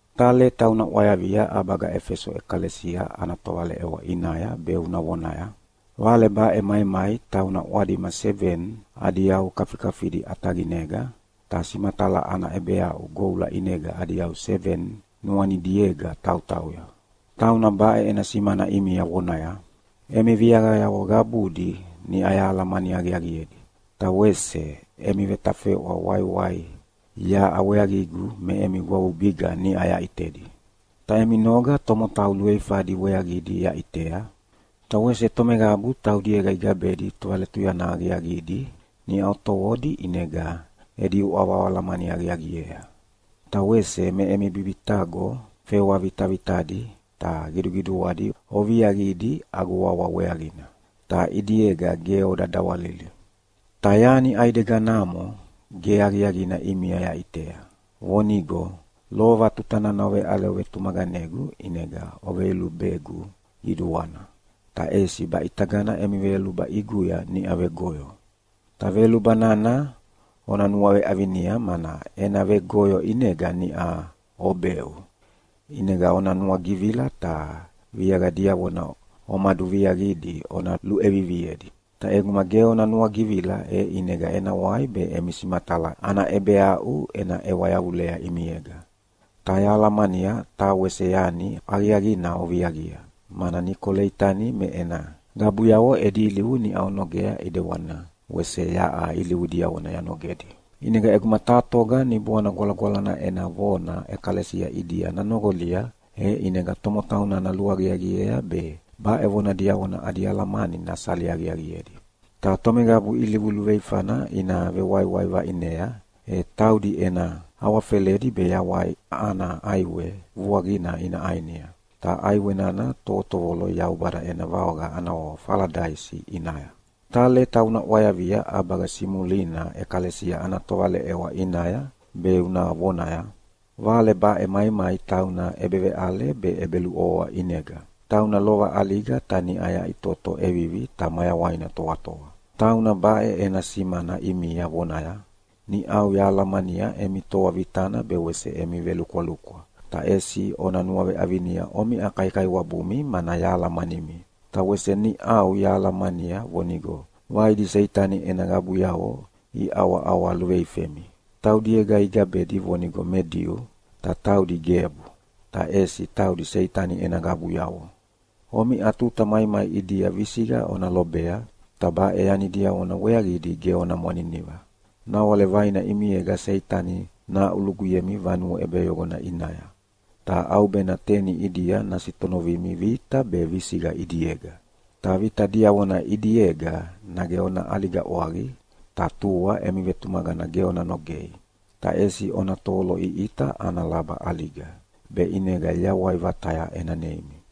“Taha leta una ʼwayavia ʼabaga Efeso ʼekalesia ana tovaleʼewa ʼinaya be una vonaya: Vale baʼe maimai tauna ʼwadima seveni adi yau kafikafidi ʼataqinega, ta simatala ana ʼebeaʼu goula ʼinega adi yau seveni nuanidiega tautauya, tauna baʼe ena simana ʼimia vonaya, Emi viaqayavo qabudi niʼa yahalamani aqiaqiedi, ta wese emi vetafeʼwa waiwai yaʼa weaqigu me emi gwavubiga niʼa yaʼitedi. Ta emi noga tomotau luveifadi weaqidi yaʼitea, ta wese tomeqabu taudiega igabedi tovaletuyana aqiaqidi niʼa otovodi ʼinega edi uʼava oalamani aqiaqiea. Ta wese me emi bibitaqo fewa vitavitadi ta qiduqiduadi oviaqidi agu wawa weaqina, ta ʼidiega ge oda dawalili. Ta yani ʼaideganamo ge aqiaqina ʼimia yaʼitea, vonigo lova tuta nana oveʼale ovetumaqanegu ʼinega oveyolubegu qiduana, ta ʼesi baʼitagana emi veyoluba ʼiguya niʼau vegoyo. Ta veyoluba nana ona nuaveʼavinia, mana ena vegoyo ʼinega niʼa obeʼu. ʼInega ona nuagivila, ta viaqa diavona omaduviaqidi ona luʼeviviedi. Ta ʼeguma ge ona nuagivila, e ʼinega ena wai be emi simatala ana ʼebeaʼu ena ʼewa yavulea ʼimiega. Ta yahalamania taha wese yani aqiaqina oviaqia, mana Nikoleitani me ena qabuyavo edi ilivu niʼa onogea ʼedewana wese yaʼa ilivu diavona yanogedi. ʼInega ʼeguma taha toga Niboana Gwalagwalana ena vona ʼekalesia ʼidia nanoqolia, e ʼinega tomotau nana luaqiaqiea be baʼe vona diavona adi alamani nasali aqiaqiedi. Ta tomeqabu ilivu luveifana ina vewaiwai vaʼinea, e taudi ena awafeledi be Yawai ana ʼAiwe vuaqina ina ʼainia, ta ʼaiwe nana tovotovolo Yaubada ena vaoqa ana wawa Faladaisi ʼinaya. “Taha leta una ʼwayavia ʼabaga Simulina ʼekalesia ana tovaleʼewa ʼinaya be una vonaya, Vale baʼe maimai tauna ʼebeveʼale be ʼebeluʼovoa ʼinega, tauna lova ʼaliga ta niʼa yaʼitoto ʼevivi ta mayawaina toatoa. Tauna baʼe ena simana ʼimia vonaya, Niʼau yahalamania emi toa vitana be wese emi velukwalukwa, ta ʼesi ona nuaveʼavinia omiʼa kaikaiwabumi mana yahalamanimi. Ta wese niʼau yahalamania vonigo vaidi Seitani ena qabuyavo iʼawaʼawa luveifemi. Taudiega igabedi vonigo me Diu, ta taudi gebu, ta ʼesi taudi Seitani ena qabuyavo. Omiʼa tuta maimai ʼidia visiqa ona lobea, ta baʼe yani diavona weaqidi ge ona mwaniniva. Nawale vaina ʼimiega Seitani nahaʼuluguyemi vanue ʼebeyoqona ʼinaya. Ta ʼaubena teni ʼidia nasitonovimi vita be visiqa ʼidiega. Ta vita diavona ʼidiega nage ona ʼaliga ʼwaqi, ta tua emi vetumaqana ge ona nogei, ta ʼesi ona tovoloʼiʼita ana laba ʼaliga, be ʼinega yawai vataya ena neimi.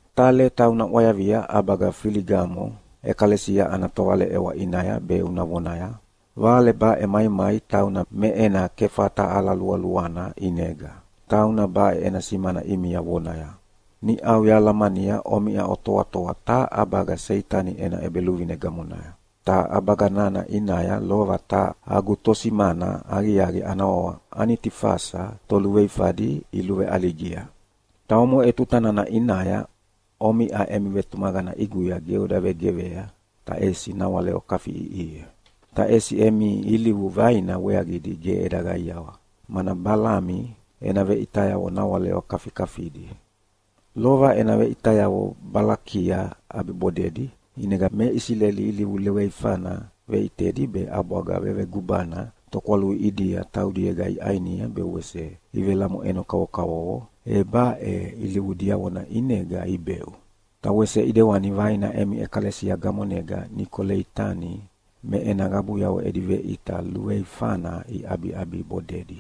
“Taha leta una ʼwayavia ʼabaga Feligamo ʼekalesia ana tovaleʼewa ʼinaya be una vonaya, Vale baʼe maimai tauna me ena kefata ala lualuana ʼinega, tauna baʼe ena simana ʼimia vonaya, Niʼau yahalamania omiʼa otoatoa taha ʼabaga Seitani ena ʼebeluvine gamonaya. Ta ʼabaga nana ʼinaya lova taha agu tosimana aqiaqi ana wawa Anitifasa toluveifadi iluveʼaligia. Ta omoʼe tuta nana ʼinaya omiʼa emi vetumaqana ʼiguya ge oda vegeqea, ta ʼesi nawale okafiʼiʼihia. Ta ʼesi emi ilivu vaina weaqidi ge eda qaiawa, mana Balami ena veʼitayavo nawale okafikafidi. Lova ena veʼitayavo Balakia ʼabibodedi, ʼinega me Isileli ilivu luveifana veʼitedi be ʼabwaga vevegubana tokwalui ʼidia taudiega iʼainia be wese ivelamoʼeno kavokavovo, e baʼe ilivu diavona ʼinega ibeʼu. Ta wese ʼidewani vaina emi ʼekalesia gamonega Nikoleitani me ena qabuyavo edi veʼita luveifana iʼabiʼabibodedi.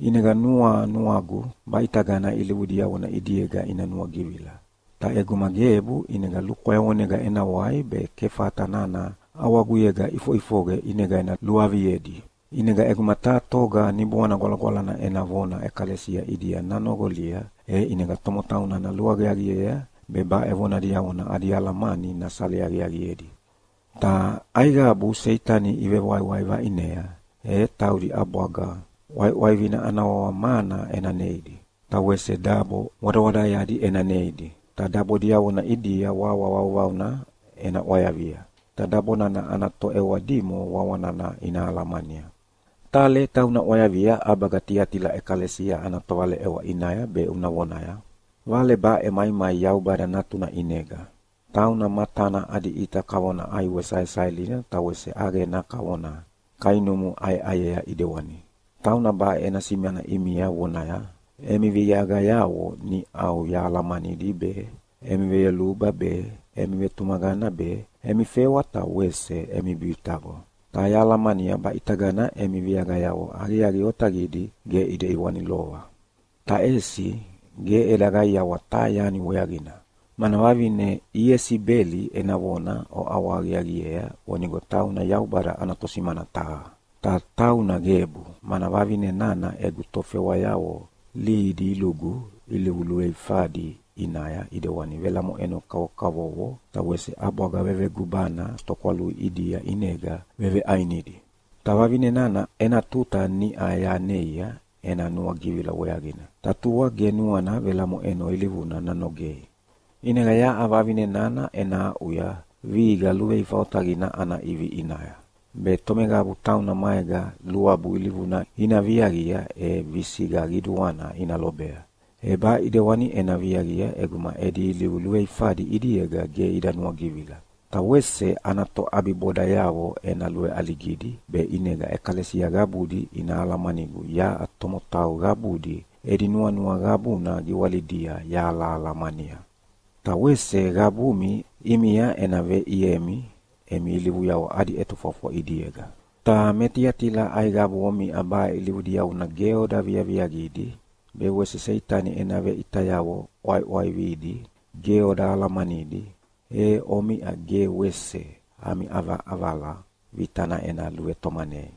ʼInega nuanuagu baʼitagana ilivu diavona ʼidiega ina nuagivila. Ta ʼeguma gebu, ʼinega lukwayavonega ena wai be kefata nana ʼawaguyega ʼifoʼifoqe ʼinega ena luaviedi. ʼInega ʼeguma taha toga Niboana Gwalagwalana ena vona ʼekalesia ʼidia nanoqolia, e ʼinega tomotau nana luaqiaqiea be baʼe vona diavona adi alamani nasali aqiaqiedi. Ta aiqabu Seitani ivewaiwai vaʼinea, e taudi ʼabwaga ʼwaiʼwaivina ana wawa mana ena neidi. Ta wese dabo wadawadaeadi ena neidi, ta dabo diavona ʼidia wawa vauvauna ena ʼwayavia. Ta dabo nana ana toʼewa dimo wawa nana ina alamania. “Taha leta una ʼwayavia ʼabaga Tiatila ʼekalesia ana tovaleʼewa ʼinaya be una vonaya, Vale baʼe maimai Yaubada Natuna ʼinega, tauna matana adi ʼita kavona ʼaiwe saesaelina ta wese ʼaqena kavona kainumu ʼayeʼayea ʼidewani. Tauna baʼe ena simana ʼimia vonaya, Emi viaqayavo niʼau yahalamanidi be, emi veyoluba be, emi vetumaqana be, emi fewa ta wese emi bibitaqo. Ta yahalamania baʼitagana emi viaqayavo aqiaqi otaqidi, ge ʼidewani lova. Ta ʼesi ge eda qaiawa taha yani weaqina, mana vavine Iesibeli ena vona oʼawahaqiaqiea vonigo tauna Yaubada ana tosimana taha. Ta tauna gebu, mana vavine nana egu tofewayavo lihidi ilugu ilivu luveifadi ʼinaya ʼidewani velamoʼeno kavokavovo ta wese ʼabwaga vevegubana tokwalui ʼidia ʼinega veveʼainidi. Ta vavine nana ena tuta niʼa yaneia ena nuagivila weaqina, ta tua ge nuana velamoʼeno ilivuna nanogei. ʼInega yaʼa vavine nana ena aʼuya vihiqa luveifa otaqina ana ʼivi ʼinaya, be tomeqabu tauna maega luabu ilivuna ina viaqia e visiqa qiduana ina lobea. E baʼe ʼidewani ena viaqia ʼeguma edi ilivu luveifadi ʼidiega ge ida nuagivila. Ta wese ana toʼabibodayavo ena luveʼaligidi be ʼinega ʼekalesia qabudi ina alamanigu yaʼa tomotau qabudi edi nuanua qabuna giwalidia yahalahalamania. Ta wese qabumi ʼimia ena veʼiemi emi ilivuyavo adi ʼetofwafwa ʼidiega. Ta me Tiatila aiqabu omiʼa baʼe ilivu diavona ge oda viaviaqidi be wese Seitani ena veʼitayavo ʼwaiʼwaividi ge oda alamanidi, e omiʼa ge wese ami ʼavaʼavala vitana ena luvetomanei.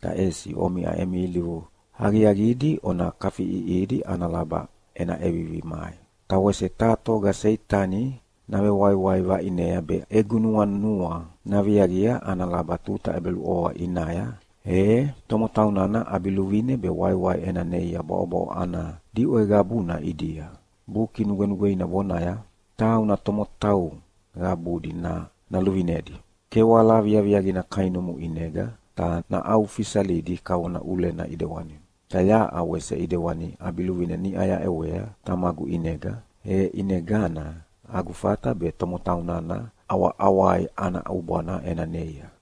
Ta ʼesi omiʼa emi ilivu aqiaqidi ona kafiʼiʼihidi ana laba ena ʼevivi mai. Ta wese taha toga Seitani navewaiwai vaʼinea be egu nuanua naviaqia ana laba tuta ʼebeluʼovoa ʼinaya, e tomotau nana ʼabiluvine be waiwai ena neia bwaʼobwaʼo ana diʼwe qabuna ʼidia. Buki Nugwenugweina vonaya, ‘Tauna tomotau qabudi naluvinedi kewala viaviaqina kainumu ʼinega, ta naʼaufisalidi kavona ʼulena ʼidewani.’ Ta yaʼa wese ʼidewani ʼabiluvine niʼa yaʼewea Tamagu ʼinega, e ʼinegana agu fata be tomotau nana ʼawaʼawai ana ʼubwana ena neia.